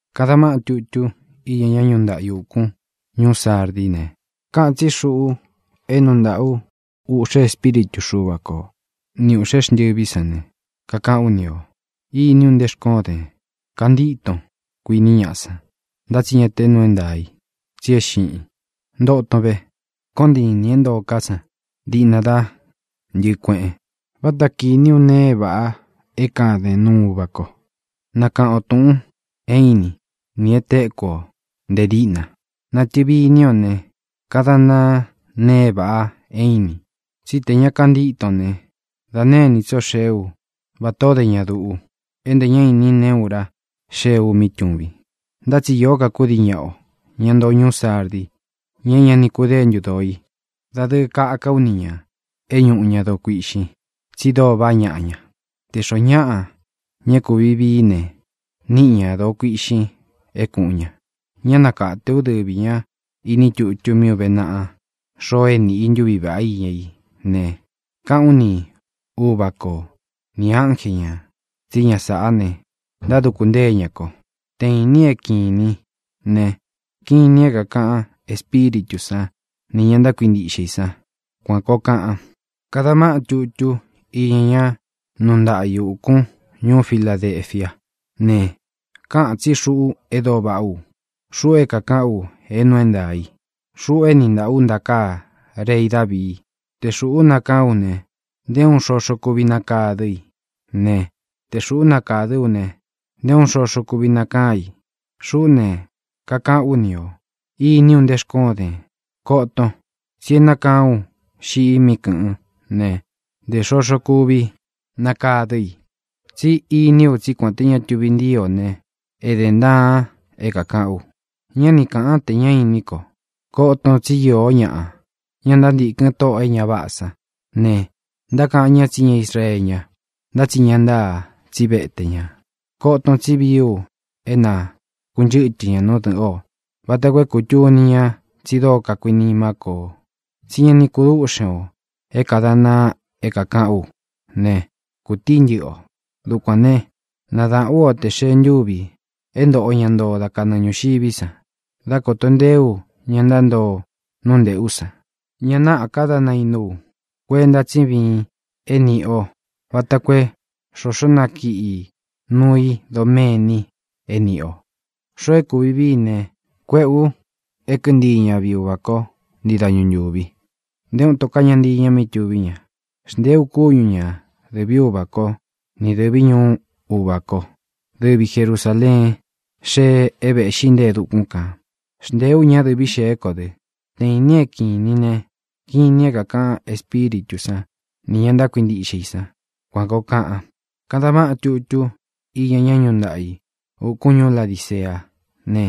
ʼKadan váꞌan tutú iña ñá nuu ntaꞌa i ūkún ñuú Sardí ne, káꞌān tsí Xuꞌu é nuu ntaꞌa ú uꞌxe espíritu Xuva ko ni ūꞌxé xntɨví san ne, kakaꞌán u ni ō. Iní u nte xkóon dēn. Kantíton, kuiní ñaꞌa san, ntá tsi ñá te nuu é ntaā i, tsi é xiꞌin. Ntoton ve. Koon ntiin nī é ntoo ká san diꞌna dá ntɨꞌɨ̄ kueꞌen. Váta kīní u nee é vāꞌa é kāden nuu Uvá ko. Nakaꞌan o tūꞌun é īnín nī e téku o nte díꞌna. Nātɨvi iní o ne, kadan ntaan nēe é vāꞌa é īnin. Tsí tē ña kantíton ne, da née inī tsó xee ú vatā ó de ña duꞌu, é ntē ñá inin neé ura xee u mí tūvin. Ntá tsi īó ka kudii ñaꞌa o, ña ntoo ñuú Sardi, ña é ña ni kudéntu dōo i. Dadɨɨ kaka ú ni ñā é ñuꞌu ña doo kuiꞌxin, tsi dóo vaꞌá ñaꞌa ña. Tē xoó ñaꞌa, ña é kūvi vií i ne, níꞌi ñā doo kuiꞌxin é kūꞌun ña. Ñá nakāte ú dɨvī ñá iní tutu mí ūve naꞌa xoo é niꞌi ī ntuví vaꞌá iña í ne, kaꞌán u ni Uvā kó nī ánje ñā tsí ña sāꞌá ne, ntáduku ntée ña ko. ¡Te īnin é kīnin ne, kinin é kākaꞌan Espíritū san ni ña ntákuintiꞌxe i san! Kuān koo kaꞌan. ʼKadan váꞌan tutú iña ñá nuu ntaꞌa i ūkún ñuú Filadefiá ne, káꞌān tsí Xuꞌu e dóo vaꞌá u, Xuꞌu é kākaꞌán u é nuu é ntaā í, Xuꞌu é nīꞌi ntaꞌa ú ntakāá rei Davii. Te Xūꞌú nakaán u ne, nté uun xoxo kuvi nakadɨ i ne, te Xūꞌú nakādɨ ú ne, nté uun xoxo kuvi nakaán i. Xuꞌú ne, kakaꞌán u ni ō. Iní u nte xkóon dēn. Koton, tsi é nakaán u xiꞌi mí kɨ̄ꞌɨ́n ne, ntē xoxo kuvi nakadɨ i. Tsí iní u tsí kuān té ña tuvi ntíi o ne, ēden ntaan é kākaꞌán u, ñá ni kāꞌan te ñá inín ko. Koton, tsí īó ñaꞌa, ña ntántīkɨn tóꞌō e ña váꞌā sán ne, ntákaꞌan ñá tsi ña Israeé ña, ntá tsi ña ntáa, tsí vete ñā. Koton, tsí vií u é na kūnchɨ́tɨ ña nú dɨ̄ꞌɨn o vata koo é kūtuni ña tsi dóo kakuinimá ko o. Tsí ña ni kudúꞌxen ō é kādan ntaan é kākaꞌán u ne, kūtií ntɨꞌɨ o. Dukuān ne, nadaꞌán u o tē xee ntúvi é ntōꞌo ña ntoo dá kanɨɨ ñūxiví san, dá kōto nteé u ña ntántoo nú nteꞌu san. Ña náꞌā ka dá nainú u. Kuenta tsí viin é nīꞌi o vata koo é xoxo nakiꞌi núu i doméni é nīꞌi o. Xoo é kūvi vií i ne, kuéꞌē u é kɨꞌɨ ntii ña viꞌi Uvā kó ntii dañu ntūvi. Nté uun ito ká ña ntii ña mí tuví ña. Xntēé u kúñu ña dɨ̄ví Uvā kó ni dɨ̄ví ñuú Uvā kó, dɨvi Jerusāleén xee é vēꞌxí nte e dukún kān. Xntee ú ña dɨ̄ví xeé ko dɨ. ¡Te īnin é kīnin ne, kinin é kākaꞌan Espíritū san ni ña ntákuintiꞌxe i san! Kuān koo kaꞌan. ʼKadan váꞌan tutú iña ñá nuu ntaꞌa i ūkún ñuú Ladiceá ne,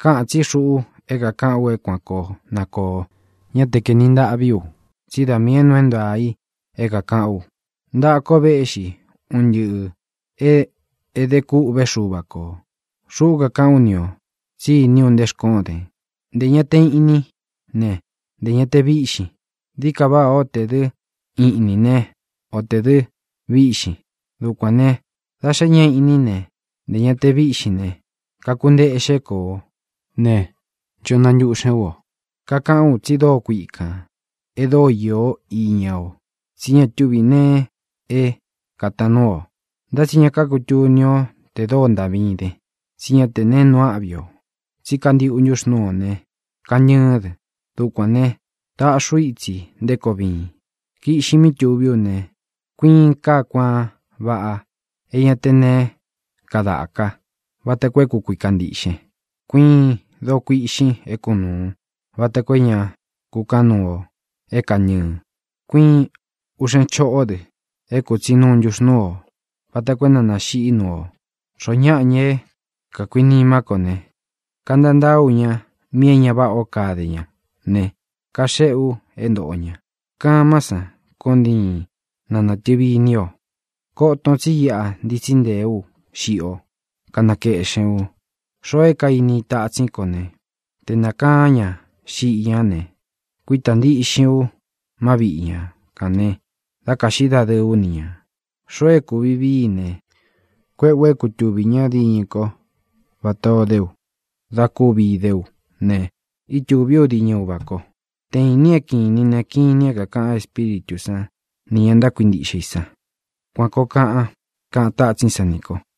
káꞌān tsí Xuꞌu é kākaꞌán u é kuan koo na kōo. Ñá te kaēni ntaꞌví u, tsí da miī é nuu é ntaā i é kākaꞌán u. Ntaꞌa ko véꞌxi un ntɨꞌɨ̄ é ede kûꞌvé Xuva kō. Xuꞌu kakaꞌán u ni ō tsí iní u nte xkóon dēn. Ntē ña te iꞌnín ne, ntē ña te víꞌxin. Dií ka váꞌā ó tē dɨ́ iꞌnīn né, o tē dɨ́ vīꞌxin. Dukuān ne, da xé ña te iꞌnín, ntē ña te víꞌxin ne, kakunteꞌxé ko o ne, ncho nantuꞌxen ú o. Kakaꞌan tsi dóo kuikān, e dóo iō íña o, tsí ña tuvi nee é kātaan nuú o. Ntá tsi ña kakutuni o te dóo ntaꞌvín den, tsí ña te neé nuu áꞌvi o, tsí kantiꞌu ntuxnúu o ne, kantɨɨ́n dɨ. Dukuān ne, taꞌxi ú itsi nté koo viin: Kiꞌxin mí tuví u ne, kuiin kaá kuaan vaꞌa é ña te neé kadáka vata koo é kukuikan ntīꞌxen. Kuiin doo kuiꞌxin é kunūun vata koo é ña kukaꞌan nuu o é kāntɨɨn. Kuiin uꞌxen choꞌó dɨ é kūtsí nuu ntuxnúu o vata koo é na nāxiꞌí nuu o. Xoó ñaꞌa, ña é kākuinimá ko ne, kantantaá u ña míꞌī é ña váꞌā ó kade ña ne, kaxeꞌé u é ntōꞌo ña. Kamán san koon ntiin ná nātɨvi iní o. Koton tsi iꞌa ntitsí ntēé u xiꞌi o, kanakeꞌxēn u. Xoo é kainí i tatsín ko ne, te nākaán ña xiꞌi ñá ne, kuítā ntíꞌxin u má viꞌi ña kān ne, dá kāꞌxí dadɨɨ ú ni ñā. Xoo é kūvi vií i ne, kuéꞌē u é kutūvi ñá diñɨ kó vatā o dé u da kuvi idé u ne, ítūví u diñɨ Uvā ko. ¡Te īnin é kīnin ne, kinin é kākaꞌan Espíritū sán ni ña ntákuintiꞌxe i san! Kuān koo kaꞌan —kaꞌan tátsín san nī ko.